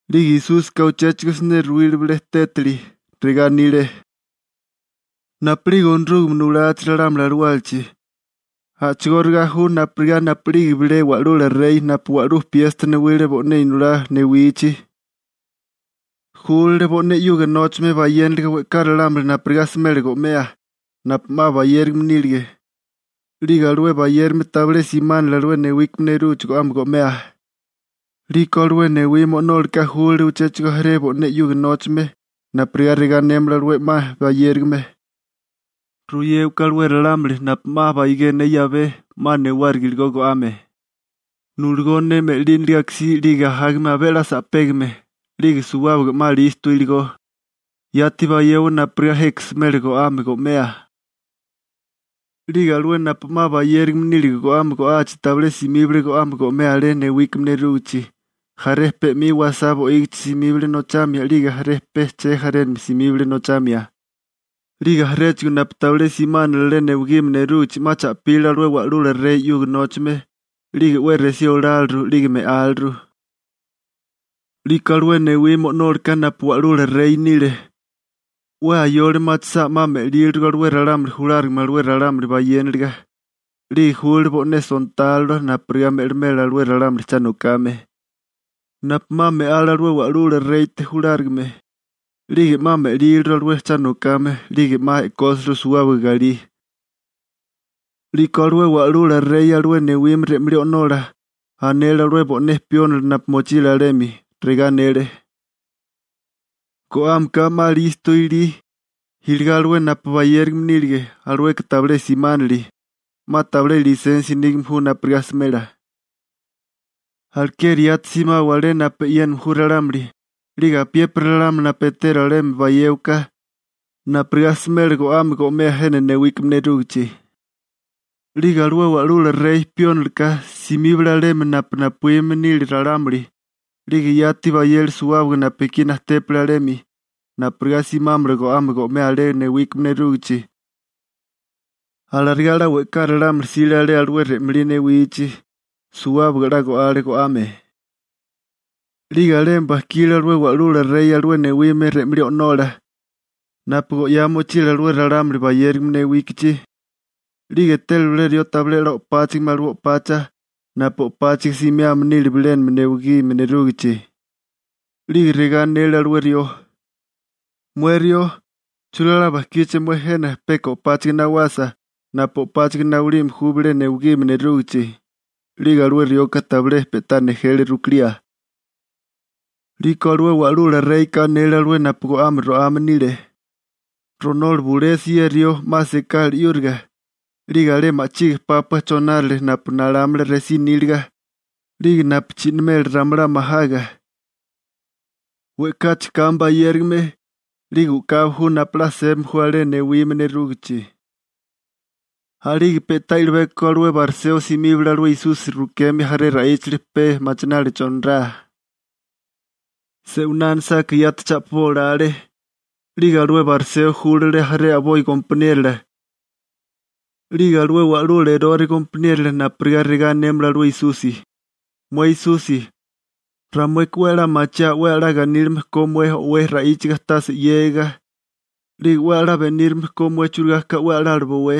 'Lige Esúsika uchéchigo siné ruwile bilé tétali, regá anile: ―Napu'lige Onorúgame nulachi ralámuli alawálachi, a'chigóriga ju napurigá napu'lige bilé wa'lula rey napu wa'lú piesta newile bo'né inolá newichi. Júlale bo'né 'yuga nóchame bayéniliga we'ká ralámuli napurigá smela go'mea, napu 'ma bayérigame nílige, 'lige alué bayérigame tabilé simánili alué newigime nerúgichi go'ame go'mea. 'Liko alué newime o'nólaka júlale uchéchigo jaré bo'né 'yuga nóchame napurigá regá anémala alué 'ma bayérigame: «Ruyéwaká alué ralámuli napu 'ma baigé ne 'yabé 'ma newáriga iligó go'ame, nuligó ne me'línaliga akasí 'lige ajágame abé 'la sa'pégame 'lige suwábaga 'ma 'la listo iligó, yati bayewa napurigá jeka smela go'ame go'mea.» 'Lige alué napu 'ma bayérigame nílige go'ame go'achi tabilé simíbale go'ame go'mea alé newigime nerúgichi, jaré pe 'mi wasá bo'ígichi simíbale nochamia 'lige jaré pe che jarénami simíbale nochamia, 'lige jaréchigo napu tabilé simánale alé newigime nerúgichi 'ma cha'pile alué wa'lula rey 'yuga nóchame, 'lige 'we resí oláliru 'lige me'áliru. 'Liko alué newime o'nólaka napu wa'lula rey nile, 'we ayole machisá 'ma me'lílirigo alué ralámuli julárigame alué ralámuli bayéniliga, 'lige júlale bo'né sontálola napurigá me'limela alué ralámuli cha nokame, napu 'ma me'ale alué wa'lula reyte julárigame, 'lige 'ma me'líliru alué cha nokame 'lige 'ma e'kósiliru suwábaga galí. 'Liko alué wa'lula rey alué newime re'malí o'nola anele alué bo'né piónila napu mochile alemi, regá anele: «Go'ámeka 'ma listo ilí, iligá alué napu bayérigame nílige, alueka tabilé simánili, 'ma tabilé lisensia nígame ju napurigá smela. Alekeri yati simawa alé napu e'yéname ju ralámuli, 'lige apiépiri ralámuli napu eteru alemi bayéwaká napurigá smela go'ame go'mea jena newigíme nerúgichi.» 'Lige alué wa'lula rey piónila ka simíbale alemi napu napuíme ju ralámuli 'lige yati bayele suwábaga napu ekí najtépale alemi, napurigá simámala go'ame go'mea alé newigime nerúgichi, alarigá 'la we'ká ralámuli jsile alé alué re'malí newichi, suwábaga 'la go'ale alué go'ame. › 'Lige alemi bajkile alué wa'lula rey alué newime re'malí o'nola, napu go'yá mochile alué ralámuli bayérigame newíkichi, 'lige etele bilé rió tabilé o'páchigime alué o'pacha napu o'páchaga simiame nile bilénami newigime nerúgichi. 'Lige regá anele alué rió: «Mué rió, ¿churigá 'la bajkíché mué jena peka o'páchaga nawasa napu o'páchaga nawilime ju bilé newigime nerúgichi?» 'Lige alué rioka tabilé pe'tá nejele rukilía. 'Liko alué wa'lula reyka anele alué napu go'ame ro'ame nile: «Ronola bulesi ye rió 'ma sekala 'yúriga, 'lige alé ma'chige pápua chonárale napu nalámala resí níliga 'lige napu chi'namela ramalá majaga.» We'káchigo kame bayérigame 'lige u'kabi ju napu 'la sébame ju alé newigime nerúgichi. A'lige pe'tá i'libeko alué bariseo simíbale alué Esusi rukemia jaré ra'íchali pe machináliga chonirá. Se'winá anisáká yati cha'pibó olale. 'Lige alué bariseo júlale jaré a'boi gompaniérola 'lige alué wa'lula Erore gompaniérola napurigá regá anémala alué Esusi: ―Mué Esusi, ramueka 'we a'lá machiaa 'we a'lá ganílime ko mué 'la o'wé ra'íchiga tase 'yégiga, 'lige 'we a'lá benírame ko mué churigá ka alué 'we a'lala bowé.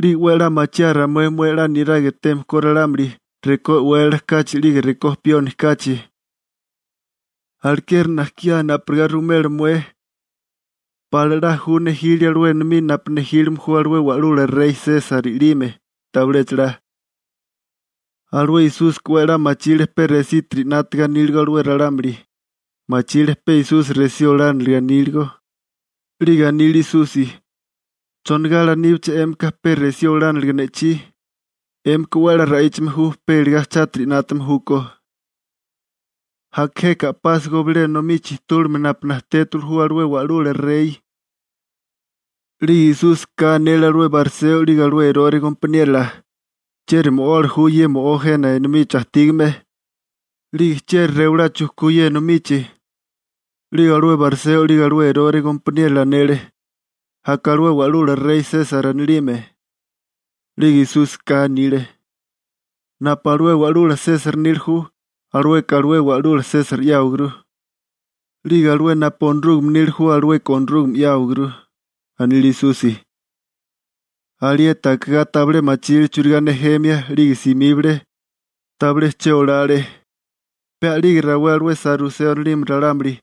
'Lige 'we a'lá machiaa ramué mué 'la niraga eteme ko ralámuli, rekó e'wélala kachi 'lige rekó pioni kachi. Alekeri najkiá napurigá ruwimela mué: ¿Pala 'la ju nejilia alué enomí napu nejílime ju alué wa'lula rey Sesar i'lime? ¿Tabiléchala? Alué Esúsika 'we a'lá machile pe resítiri 'nátaga aníligo alué ralámuli, machile pe Esusi resí olániliga aníligo, 'lige anile Esusi: ―¿Chonigá alaníbiché 'émika pe resí olániliga ne'chí? 'Émika 'we a'lá ra'íchame ju pe iligá chátiri 'nátame júkó. Aka jeka a'pásigo bilé enomí chijtúligame napu najtétiwili ju alué wa'lula rey. 'Lige Esúsika anele alué bariseo 'lige alué Erore gompaniérola: ―¿Chieri mo'ola ju ye mo'ó jena enomichi ajtígame, 'lige chieri rewalá chujkú ye enomichi? 'Lige alué bariseo 'lige alué Erore gompaniérola anele: ―Aka alué wa'lula rey Sesar anilime. 'Lige Esúsika anile: ―Napu alué wa'lula Sesar nila ju, alueka alué wa'lula Sesar 'yáwaguru, 'lige alué napu Onorúgame nila ju, alueka Onorúgame 'yáwaguru ―anile Esusi. Alieti akigá tabilé machile churigá nejemia 'lige simíbale, tabilé che olale. Pe a'lige rawé alué saruseo anilime ralámuli,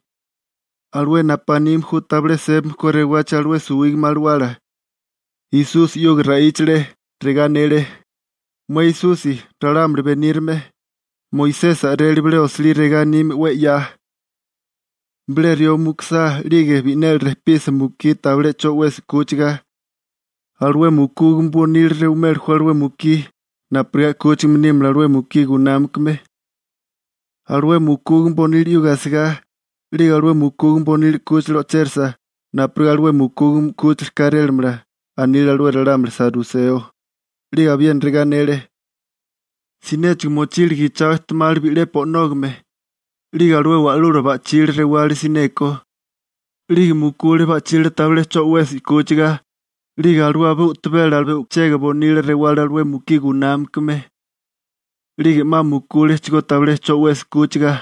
alué napu anime ju tabilé sébame ko rewagachi alué suwígame alawala, Esusi 'yuga ra'íchale, regá anele: ―Mué Esusi, ralámuli benírame. Moisesi a'rele bilé osilí regá anime 'we 'ya: Bilé rió mukusá 'lige bi'neli rejpisa mukí tabilé 'cho 'wesi 'kúchiga, alué mukúgame bonila rewimeli ju alué mukí napurigá 'kúchigame nímala alué mukí gunámakame, alué mukúgame bonila 'yuga asigá, 'lige alué mukúgame bonila 'kúchila o'chérisa napurigá alué mukúgame 'kúchila kárélamala ―anile alué ralámuli saruseo. 'Lige abiena regá anele: ―Sinéchigo mochile gichao ejtemali bi'lepi o'nógame, 'lige alué wa'lula ba'chila rewale sineko, 'lige mukule ba'chila tabilé 'cho 'wesi 'kúchiga, 'lige alué abé u'tabela alué chega bonila rewale alué mukí gunámakame, 'lige 'ma mukúlechigó tabilé 'cho 'wesi 'kúchiga.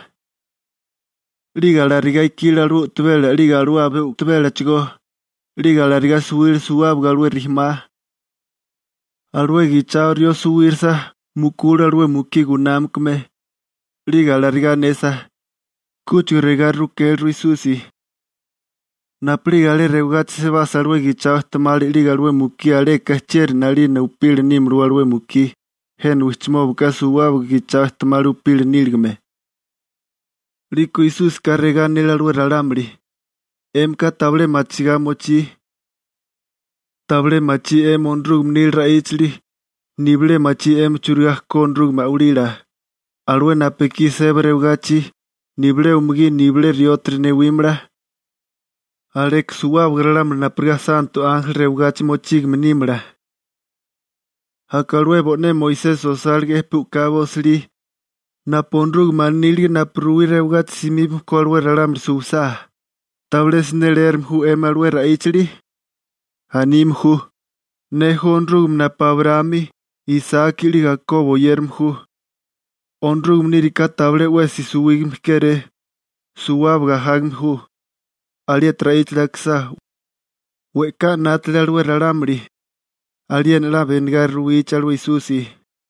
'Lige alarigá ikile alué u'tabela 'lige alué abé u'tabélachigó, 'lige alarigá suwile suwábaga a'boi najarémala. Alué gichao rió suwírisa, mukule alué mukí gunámakame. 'Lige alarigá anesa, kúchigo regá rukéliru Esusi: ―Napu'lige alé rewagachi sebasa alué gichao ejtemali 'lige alué mukí aleka, ¿chieri 'nalina upila nímalawé alué mukí? Jena wijchimóbaka suwábaga gichao ejtemali upila níligame. 'Liko Esúsika regá anele alué ralámuli: ―'Émika tabilé machigá mochí. Tabilé machí 'emi Onorúgame nila ra'íchali, nibilé machí 'emi churigá ko Onorúgame a'walila. Alué napu ekí seba rewagachi, nibilé umugí nibilé riótiri newímala, aleka suwábaga ralámuli napurigá santo ánjeli rewagachi mochígame nímala. Aka alué bo'né Moisesi osálige'é pe u'kabi osilí, napu Onorúgame anílige napu ruwí rewagachi simíbame ko alué ralámuli suwisá. ¿Tabilé siné leérame ju 'emi alué ra'íchali? Anime ju: «Ne ju Onorúgame napu Abraámi, Isaki 'lige Akobo oyérame ju.» Onorúgame níriká tabilé 'wesi suwígame kéré, suwábaga ajágame ju. Alieti ra'íchali akisá, we'ká 'nátale alué ralámuli, aliena 'la benigá ruwichi alué Esusi.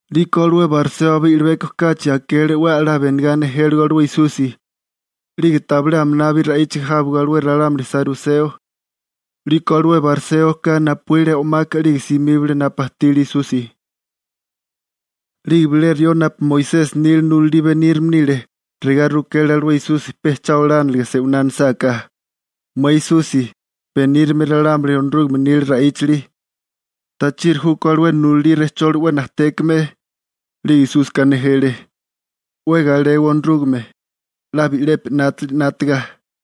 'Liko alué bariseo abé i'libeko kachi akele 'we a'lá benigá nejéligo alué Esusi, 'lige tabilé aminabi ra'íchiga jábigo alué ralámuli saruseo, 'liko alué bariséoka napuíle o'maka 'lige simíbale napu ajtile Esusi. 'Lige bilé rió napu Moisesi nila nulalí benírame nile, regá rukele alué Esusi pecha olániliga se'winá anisáká: ―Mué Esusi, benírame ralámuli Onorúgame nila ra'íchali, ¿tachiri júkó alué nulalí rejcholi 'we najtékame? 'Lige Esúsika nejele: ―'We galewa Onorúgame, 'la bi'lepi 'nátili 'nátiga.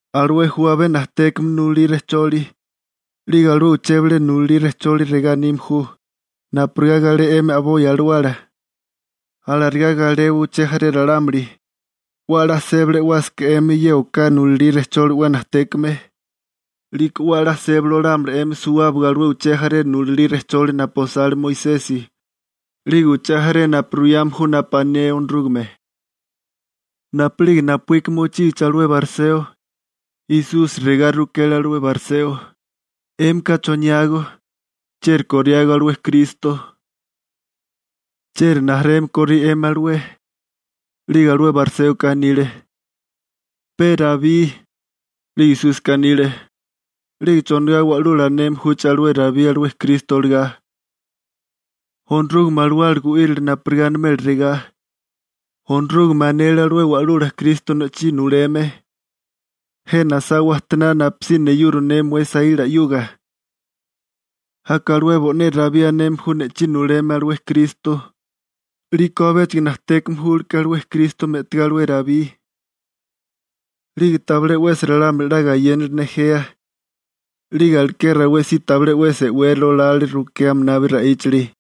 Alué ju abé najtékame nulalí rejcholi. 'Lige alué uché bilé nulalí rejcholi regá anime ju: «Napurigá galé 'emi a'boi alawala, alarigá galewa uché jaré ralámuli.» 'We a'lá sébali e'wásaká 'emi ye oká nulalí rejcholi 'we najtékame, 'liko 'we a'lá sébali olámala 'emi suwábaga alué uché jaré nulalí rejcholi napu osale Moisesi, 'lige uché jaré napu ruyame ju napu ané Onorúgame. Napu'lige napuíka mochígichi alué bariseo, Esusi regá rukele alué bariseo: ―'Émika ¿choniágó, chieri koriágó alué Kristo? ¿Chieri rijimala korí 'emi alué? 'Lige alué bariséoka anile: ―Pe Rabí. 'Lige Esúsika anile: ―¿'Lige chonigá wa'lula aneme júché alué Rabí alué Kristo olagá? Onorúgame Alawala gu'írale napurigá animela regá: Onorúgame anele alué Wa'lula Kristo ne'chí nuleme: «Jena asá wajtoná napusí neyuro ne mué saíla 'yuga.» Aka alué bo'né Rabí aneme ju «ne'chí nuleme» alué Kristo, 'liko abéchigo najtékame júleké alué Kristo me'tigá alué Rabí. 'Lige tabilé 'wesi ralámuli 'la gayénale nejea, 'lige aleké rawé si tabilé 'wesi e'wérali olale rukea aminabi ra'íchali.